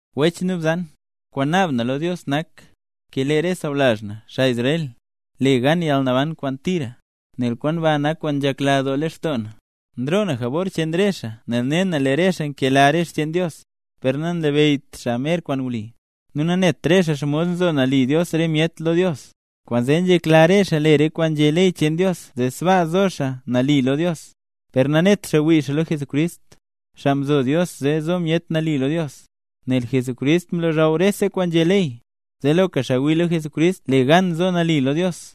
Wech nu bzan, kwaan naab na lo Dios nak, lee re sawlazh na, xaa Israel, le gan yalnaban kwaan tira, nel kwaan ba nak kwaan nzhekladoo lextoo na. Nroo na jabor cheen re xaa nel ne na lee re xaa nkela re xcheen Dios, per nanlabeyyt xaa mer kwaan wli. Nu nanet re xaa xomod nzo nali Dios re myet lo Dios, kwaanzee nzhekla re xaa le re kwaan nzhé ley cheen Dios zee sbaa zo xaa nali lo Dios; per nanet xaa wii xaa lo Jesucrist, xaa mzo Dios zee zo myet nali lo Dios; nel Jesucrist mlozhaw rese kwaan nzhé ley, zee loka xaa wii lo Jesucrist le gan zo nali lo Dios.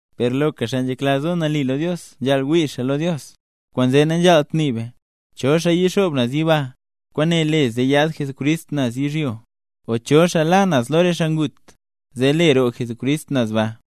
Per loka xaa nzhekla zo nali lo Dios nzhaal wii xaa lo Dios. Kwaanzee nanzhaalt nii be: “¿Cho xaa yixoob yiba, kwaan nle zee yaad Jesucrist naz yizhyo? o ¿cho xaa la naz lo re xaa ngut le zee roo Jesucrist naz baa?”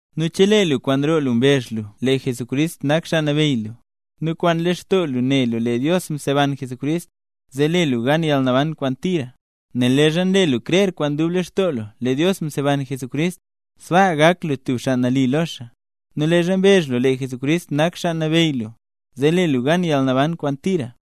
Nel chelee lu kwaan roo lu mbezh lu lee Jesucrist nak Xaa Nabeyy lu, nu kwaan lextoo lu ne lu lee Dios mseban Jesucrist, zee le lu gan yalnaban kwaan tira. Nel leezha nle lu krer kwaan dub lextoo lu lee Dios mseban Jesucrist, sbaa gak lu tub xaa nali lo xaa, nu leezha mbezh lu lee Jesucrist nak Xaa Nabeyy lu, zee le lu gan yalnaban kwaan tira.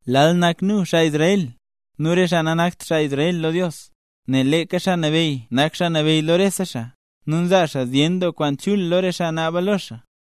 Lal nak nu, xaa Israel, nu re xaa nanakt xaa Israel lo Dios. Nel leeka Xaa Nabeyy nak Xaa Nabeyy lo rese xaa, nu nzaa xaa zyen doo kwaan chul lo re xaa naaba lo xaa.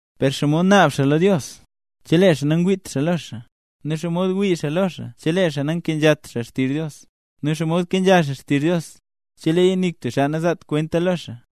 Per, ¿xomod naab xaa lo Dios chelee xaa nangwiit xaa lo xaa? ¿Nu xomod wii xaa lo xaa chelee xaa nankenzhat xaa xtizh Dios? ¿Nu xomod kenzha xaa xtizh Dios cheleeya nik tub xaa nazaat kwenta lo xaa?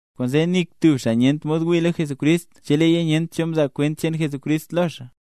Kwaanzee nik tub xaa nyent mod wii lo Jesucrist cheleeya nyent cho mzaa kwent cheen Jesucrist lo xaa.